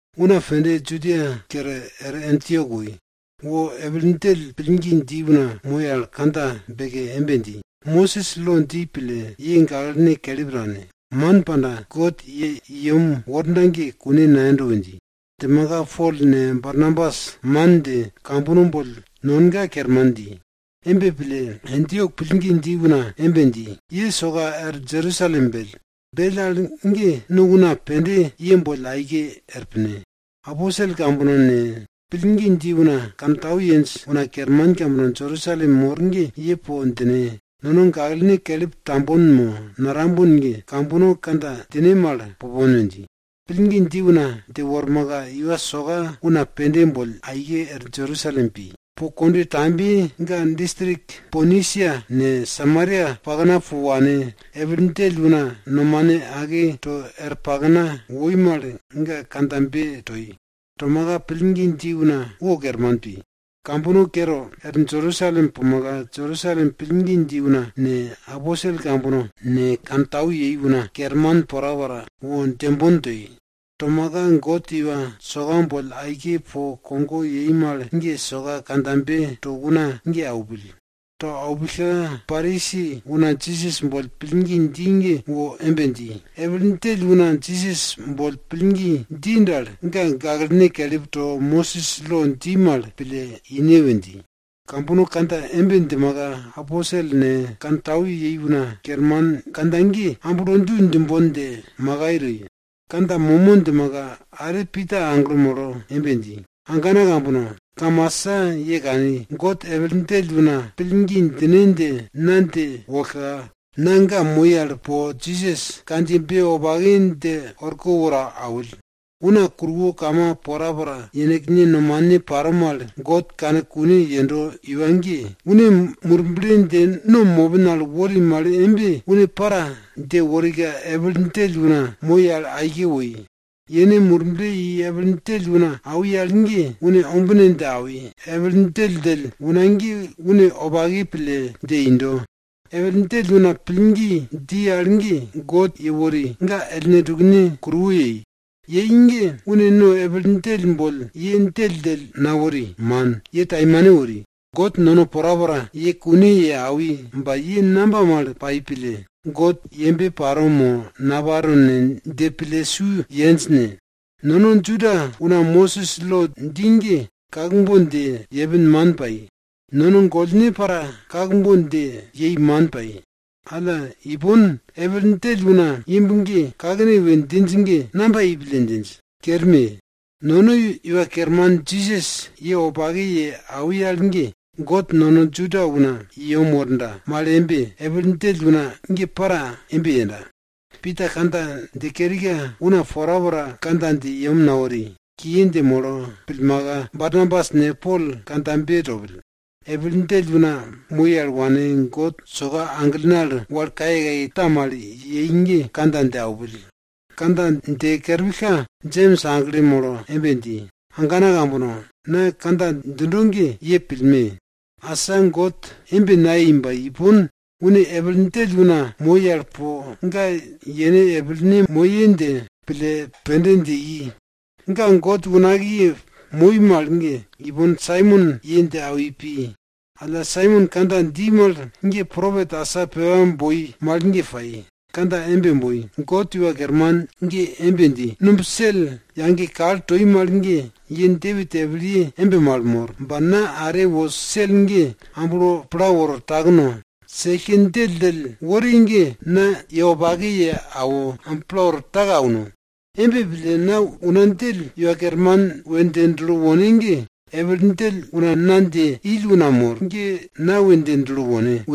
Una pende Judia kere er Antiok woi. Wo epil djell pillgi dji una moi al kandja beke embe dji, Mosis lo dji pille, ye gaklene kelip tane, man pandaka, God ye i yem worda ge kune nayendo we dji. Djimaka Pol ne, Barnabas man dje, kambono boll nonga kerman dji. Embe pille, Antiok pillgi dji una embe dji, ye soka er Jerusalem bell. Bell al ge no una pende ye boll aike er pine. Aposel kambono ne, pillgi dji una kantau yenj una kerman kambono Jerusalem mor ge, ye po djine. Nono gaklene kelip tambon mo natambon ge, kambono kandja djine mal pupon we dji. Pillgi dji una dje wormaka, iwa soka una pende boll aike er Jerusalem pi. Po kondwe tambiye ga distrik Ponisia ne, Samaria pakna po wane, epil djell una nomane ake to er pakna woi mal, ga kandjabe toi. Tomaka, pillgi dji una wo kerman pi. Kambono kere er Jerusalem pumaka, Jerusalem pillgi dji una ne, aposel kambono ne, kantau yei una kerman porapora wo djembon toi. Tomaka, God iwa soka boll aike po kogo yei mal ge, soka kandjabe to una ge aupill. To aupillka Parisi una Jisas boll pillgi dji ge wo embe dji, epil djell una Jisas boll pillgi dji dal, ga gaklene kelip to, Mosis lo dji mal pille ine we dji. Kambono kandja embe djimaka, aposel ne, kantau yei una kerman kandja ge amblo du djimbon dje makai toi. Kandja momo djimaka, are Pita aglo molo embe dji, agana ambana kambono! Kamasa ye kani, God epil djell una pillgi djine dje na dje wollka, na ga moi al po Jisas kandjiyebe wopake dje orko woro awill. Una kuruwo kama porapora yenekne nomane paro mal God kane kune yendo iwa ge, une Murble dje no mopin al wori mal embe, une para, dje worika epil djell una moi al woi. Yene Murble i epil djell una awi al ge, une ombine dje awi, epil djell una ge une wopake pille dje indo. Epil djell una pillgi dji al ge, God yewori, ga ellne tukne kuruwo yei. Yei ge, une no epil djell boll ye djelldjell nawori man, ye taimane wori. God nono porapora ye kune ye awi ba ye namba mal pai pille God yembe paro mo naparo ne dje pille su yenj ne? Nono Juda una Mosis lo dji ge kakbon dje yepin man pai. Nono gollne para kakbon dje yei man pai. Alla ipon, epil djell una imb ge kakne we djinj ge, namba yei pille djinj? Kerme! Nono Iwa Kerman Jisas ye wopake ye awi al ge, God nono Juda una i yem worda mal embe, epil djell una ge para embe yenda. Pita kandja dje kerika, una porapora kandja dje yem nawori. Kiye dje molo pillmaka, Barnabas ne, Pol kandjabe topill. Epil djell una moi al wane, God soka aglene al wal kayekaye ta mal yei ge kandja dje aupill. Kandja dje kerpillka, Jems aglo molo embe dji, agana ambana kambono, na kandja djindo ge, ye pillme! Asa God embe nayei ba ipon une epil djell una moi al po ga yene epilye moye dje pille pende dje i. Ga God unakiye moi mal ge, ipon Saimon ye dje awi pi. Alla, Saimon kandja dji mal ge propet asa pepa boi mal ge pai. Kandja embe boi, God Iwa Kerman ge embe dji, numb sel yage kal toi mal ge Depit epilye embe mal mor. Ba na are wo sel ge amblo pla woro takno, sellke djelldjell wori ge na ye wopake ye awo, amblo pla woro take auno. Embe pille una djell Iwa Kerman we dje dulo wone ge, epil djell una na dje ill una mor ge na we dje dulo wone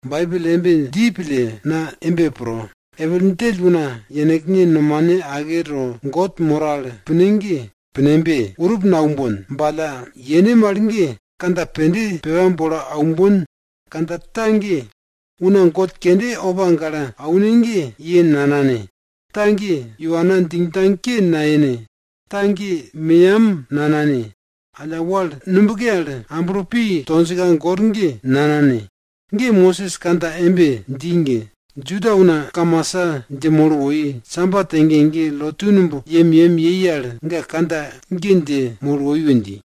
Baibel embe dji pille, na embe pro, epil djell una yenekne nomane ake to God moro al pinj ge, pinembe! Urup naumbon. Ba alla, yene mal ge kandja pende pepa bolo aumbon. Kandja ta ge, una god kende opa gale aune ge, ye nanane. Ta ge, iwana djingdjang ke nayene. Ta ge, meyam nanane, alla wal nubke al amblo pi tonjka gor ge, nanane. Ge, Mosis kandja embe dji ge, Juda una kamasa dje molo woi. Sabat ege ege, lotu numb yemyem yei al, ga kandja ge dje molo woi we dji.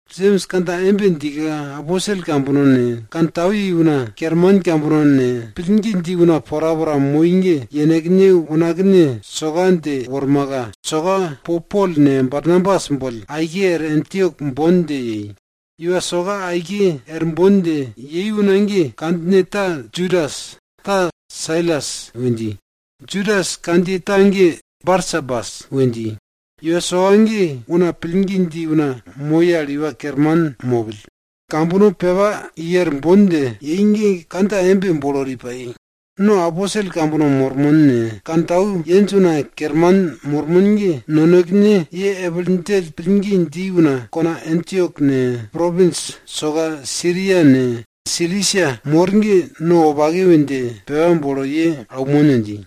Jems kandja embe djika, aposel kambono ne, kantau yei una kerman kambono ne, pillgi dji una porapora moi ge, yenekne unakne soka dje wormaka, soka po Pol ne, Barnabas boll aike er Antiok bon dje yei. Iwa soka aike er bon dje yei una ge kandjine ta Judas, ta Sailas we dji. Judas kandjiye ta ge Barsabas we dji. Iwa soka ge una pillgi dji una moi al iwa kerman mopill. Kambono pepa i er bon dje yei ge kandja embe bolo wori pai. No aposel kambono mormon ne, kantau yenj una kerman mormon ge, nonekene ye epil djell pillgi dji una kona Antiok ne, propins soka Siria ne, Silisia mor ge, no wopake we dje pepa bolo ye aunmon we dji.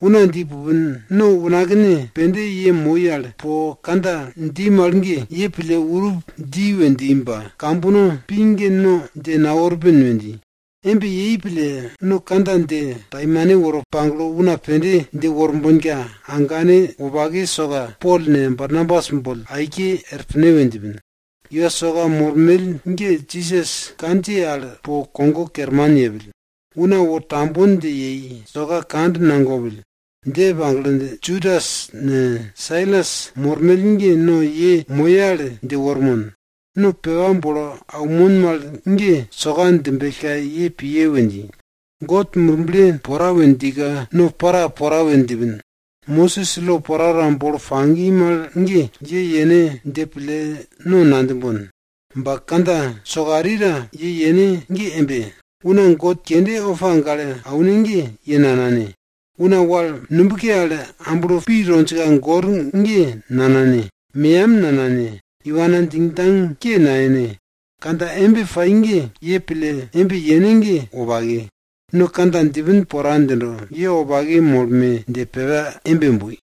Una dji pupin. No unakne pende ye moi al po kandja dji mal ge, ye pille urup dji we dji ba, kambono pi ge no dje naworpin we dji. Embe yei pille no kandja dje taimane woro pagle, una pende dje worbonka, agane wopake soka Pol ne, Barnabas boll aike er pine we djipin. Iwa soka mormell ge Jisas kandjiye al po kogo kerman yepill, una wo tambon dje yei, soka kand nagopill. Dje pagle, Judas ne, Sailas mormell ge no ye moye al dje wormon, no pepa bolo aunmon mal ge soka djimbellka ye piye we dji. God Murble pora we djika no para pora we djipin, Mosis lo porapora bolo pagi mal ge, ye yene dje pille no nadjimbon. Ba, kandja sokarita ye yene ge embe. Una god kende opa gale aune ge, ye nanane. Una wal nubke al amblo pi tonjka gor ge nanane. Meyam nanane. Iwana djingdjang ke nayene. Kandja embe pai ge, ye pille embe yene ge, wopake. No kandja djipin pora djindo. Ye wopake molme dje pepa embe boi.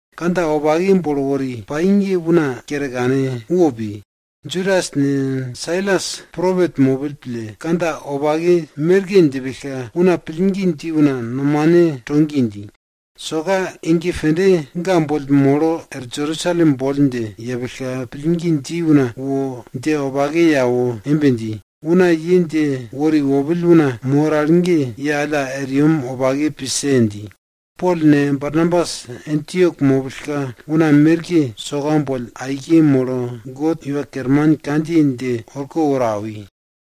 Kandja wopake bolo wori pai ge una kere kane, wo pi. Judas ne, Sailas propet mopill pille, kandja wopake merke djipillka, una pillgi dji una nomane to gi dji. Soka ege pende ga boll molo er Jerusalem boll dje yepillka, pillgi dji una wo dje wopake ye awo embe dji, una ye dje wori wopill una mor al ge ye alla er yem wopake pise dji. Pol ne, Barnabas Antiok mopillka una merke soka boll aike molo God Iwa Kerman kandjiye dje orko woro awi.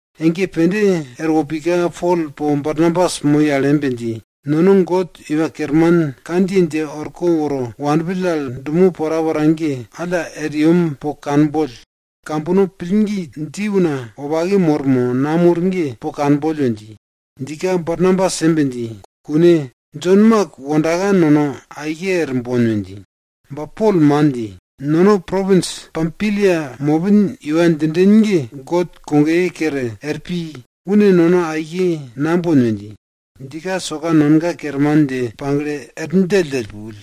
Ege pende erwo pika Pol po Barnabas moi al embe dji, nono God Iwa Kerman kandjiye dje orko woro wanpill al dumo porapora ge, alla er yem po kanboll, kambono pillgi dji una wopake mor mo namor ge po kanboll we dji. Djika Barnabas embe dji, kune, Jon Mak wondaka nono aike er bon we dji. Ba Pol man dji, nono propins Pampilia mopin iwa djinden ge God kogoye kere er pi. Une nono aike nambon we dji. Djika soka nonga kerman dje pagle er djelldjell pupill.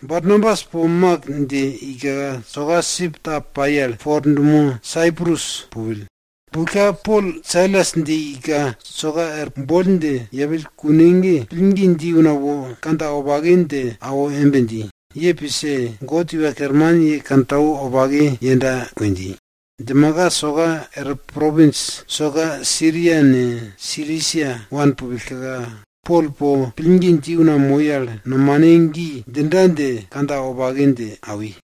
Barnabas po Mak dje ika, soka sip ta pai al po er dumo Saiprus pupill. Pupillka Pol Sailas dje ika soka er boll dje yepill kune ge, pillgi dji una wo kandja wopake dje awo embe dji, ye pise. God Iwa Kerman ye kantau wopake yenda we dji. Djimaka soka er propins soka Siria ne, Silisia wanpillka, Pol po pillgi dji una moi al nomane gi djinda dje kandja wopake dje awi.